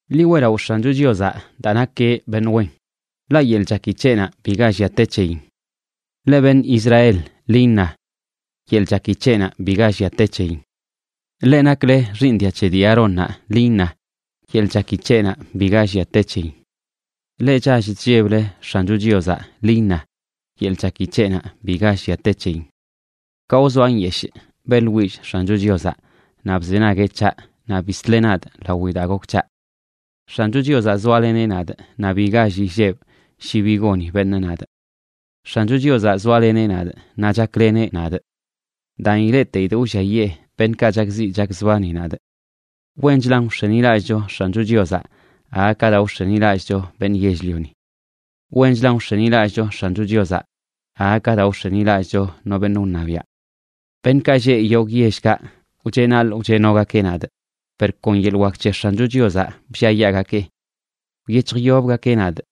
Ḻi weꞌlaꞌo X̱ancho Chiozaꞌ daa nakeꞌ beṉꞌ wen, ḻaꞌ yeḻꞌ chaki c̱heꞌnaꞌ biga llia te c̱heyin. Leꞌ beṉꞌ Israel, ḻi iṉa: “Yeḻꞌ chaki c̱heꞌnaꞌ biga llia te c̱heyin.” Leꞌ nakle xiiṉ dia c̱he dii Aarónnaꞌ, ḻi iṉa: “Yeḻꞌ chaki c̱heꞌnaꞌ biga llia te c̱heyin.” Leꞌ chall chlleble X̱ancho Chiozaꞌ, ḻi iṉa: “Yeḻꞌ chaki c̱heꞌnaꞌ biga llia te c̱heyin.” Ka wzoa nyeshꞌ, beꞌḻwillꞌ X̱ancho Chiozaꞌ; naꞌ bzenagueꞌ c̱haꞌ naꞌ bisleꞌ nadꞌ lawi daa gok c̱haꞌ. X̱ancho Chiozaꞌ zoaleneꞌ nadꞌ, naꞌ bi gall illebꞌ shi bi goni beṉꞌ nadꞌ. X̱ancho Chiozaꞌ zoaleneꞌ nadꞌ, naꞌ chakleneꞌ nadꞌ. Daan, ileꞌteidꞌ wlliayee beṉꞌkaꞌ chakziꞌ chakzbani nadꞌ. Wenchlan wx̱enilallꞌcho X̱ancho Chiozaꞌ aga ka daa wx̱enilallꞌcho beṉꞌ yell-lioni. Wenchlan wx̱enilallꞌcho X̱ancho Chiozaꞌ aga ka daa wx̱enilallꞌcho no beṉꞌ wṉabiaꞌ. Beṉꞌkaꞌ lleꞌ yogꞌ yellkaꞌ wcheꞌnaḻꞌ wcheꞌnogakeꞌ nadꞌ, per kon yeḻꞌ wak c̱he X̱ancho Chiozaꞌ blliayaagakeꞌ. Wyec̱hjyobgakeꞌ nadꞌ,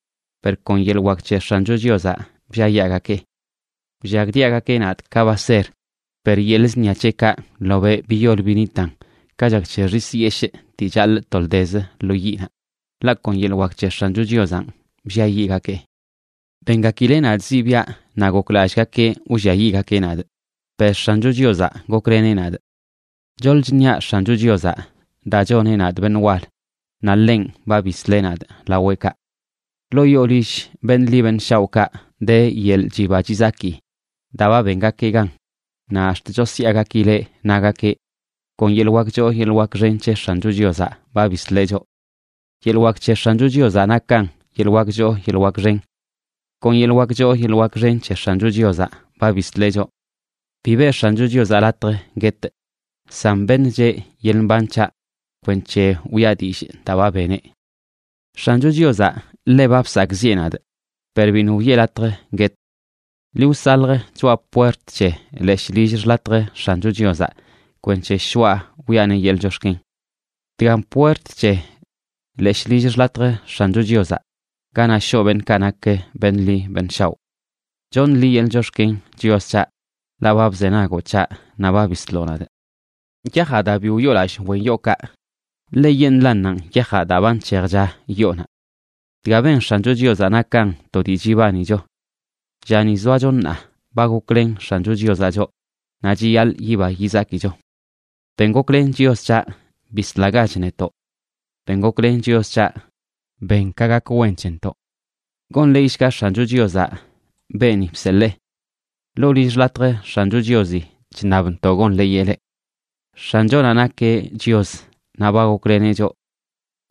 per kon yeḻꞌ wak c̱he X̱ancho Chiozaꞌ blliayaagakeꞌ. Wllagdiagakeꞌ nadꞌ ka baser, per yeḻꞌ zṉia c̱heꞌkaꞌ ḻobeꞌ biyol binitan ka chak c̱he xis yeshꞌ dii chaḻꞌ toldez lo yiꞌnaꞌ. Ḻaꞌ kon yeḻꞌ wak c̱he X̱ancho Chiozanꞌ blliayiꞌgakee. Bengakileꞌ nadꞌ zibiaꞌ naꞌ goklallꞌgakeꞌ wlliayiꞌgakeꞌ nadꞌ, per X̱ancho Chiozaꞌ gokleneꞌ nadꞌ. Choḻꞌ chṉiaꞌ X̱ancho Chiozaꞌ, daa choneꞌ nadꞌ beṉꞌ wal. Naꞌ ḻenꞌ ba bisleꞌ nadꞌ laweꞌkaꞌ. Ḻoo yoo lill beṉꞌ ḻi beṉꞌ shaoꞌkaꞌ de yeḻꞌ chiba chizaki daa ba bengakeꞌ gan, naꞌ ax̱t chosyaagakileꞌ nagakeꞌ: “Kon yeḻꞌ wak choo yeḻꞌ wak xen c̱he X̱ancho Chiozaꞌ ba bisleꞌ choꞌ. Yeḻꞌ wak c̱he X̱ancho Chiozaꞌ nakan yeḻꞌ wak choo yeḻꞌ xen. Kon yeḻꞌ wak choo yeḻꞌ wak xen c̱he X̱ancho Chiozaꞌ ba bisleꞌ choꞌ.” Bi beꞌ X̱ancho Chiozaꞌ latj guetꞌ, san beṉcheꞌ yeḻꞌ mban c̱haꞌ kwenc̱he wiꞌa dillꞌ daa ba beneꞌ. X̱ancho Chiozaꞌ ḻe ba bsakꞌziꞌe nadꞌ, per biṉꞌ wiꞌe latj guetꞌ. Ḻi wsalj choꞌa puert c̱he leshꞌ lill xḻatj X̱ancho Chiozaꞌ, kwenc̱he shoꞌa wiꞌaneꞌ yeḻꞌ chox̱ken. Dgan puert c̱he leshꞌ lill xḻatj X̱ancho Chiozaꞌ, ganaꞌ shoꞌ beṉꞌkaꞌ nak beṉꞌ ḻi beṉꞌ shaoꞌ. Choṉꞌ liꞌ yeḻꞌ chox̱ken, Chios c̱haꞌ, ḻaꞌ ba bzenagoꞌ c̱haꞌ naꞌ ba bisloꞌ nadꞌ. Yajaꞌ daa bi wyoolallꞌ wen yookaꞌ, ḻeyeṉꞌlannanꞌ yajaꞌ daa ba nc̱hejcha yoonaꞌ. Dga ben X̱ancho Chiozaꞌ nakan to dii chibanicho. Llani zoacho ṉaa ba goklen X̱ancho Chiozaꞌ choꞌ, naꞌ chiyaḻꞌ yiba yizakicho. Ben goklen, Chios c̱haꞌ, bislagach netoꞌ. Ben goklen, Chios c̱haꞌ, ben ka gak wen c̱hentoꞌ. ¡Gonḻeeyshga X̱ancho Chiozaꞌ beeni bseḻee! Ḻoo lill xḻatj X̱ancho Chiozi chṉabntoꞌ gonḻeeyeꞌ leꞌ. X̱anchonaꞌ nakeꞌ Chios, naꞌ ba gokleneꞌ choꞌ.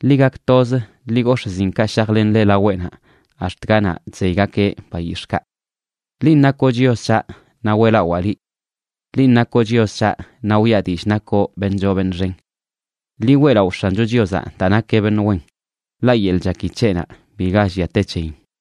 Ḻi gak toz, ḻi gox̱ꞌ zinkaꞌ shajlenle laweꞌnaꞌ ax̱t ganaꞌ chzeygakeꞌ bayix̱ꞌkaꞌ. Linꞌ nakoꞌ Chios c̱haꞌ, naꞌ weꞌlawaa liꞌ. Linꞌ nakoꞌ Chios c̱haꞌ, naꞌ wiꞌa dillꞌ nakoꞌ beṉꞌ choo beṉꞌ xen. Ḻi weꞌlaꞌo X̱ancho Chiozaꞌ daa nakeꞌ beṉꞌ wen, ḻaꞌ yeḻꞌ chaki c̱heꞌnaꞌ biga llia te c̱heyin.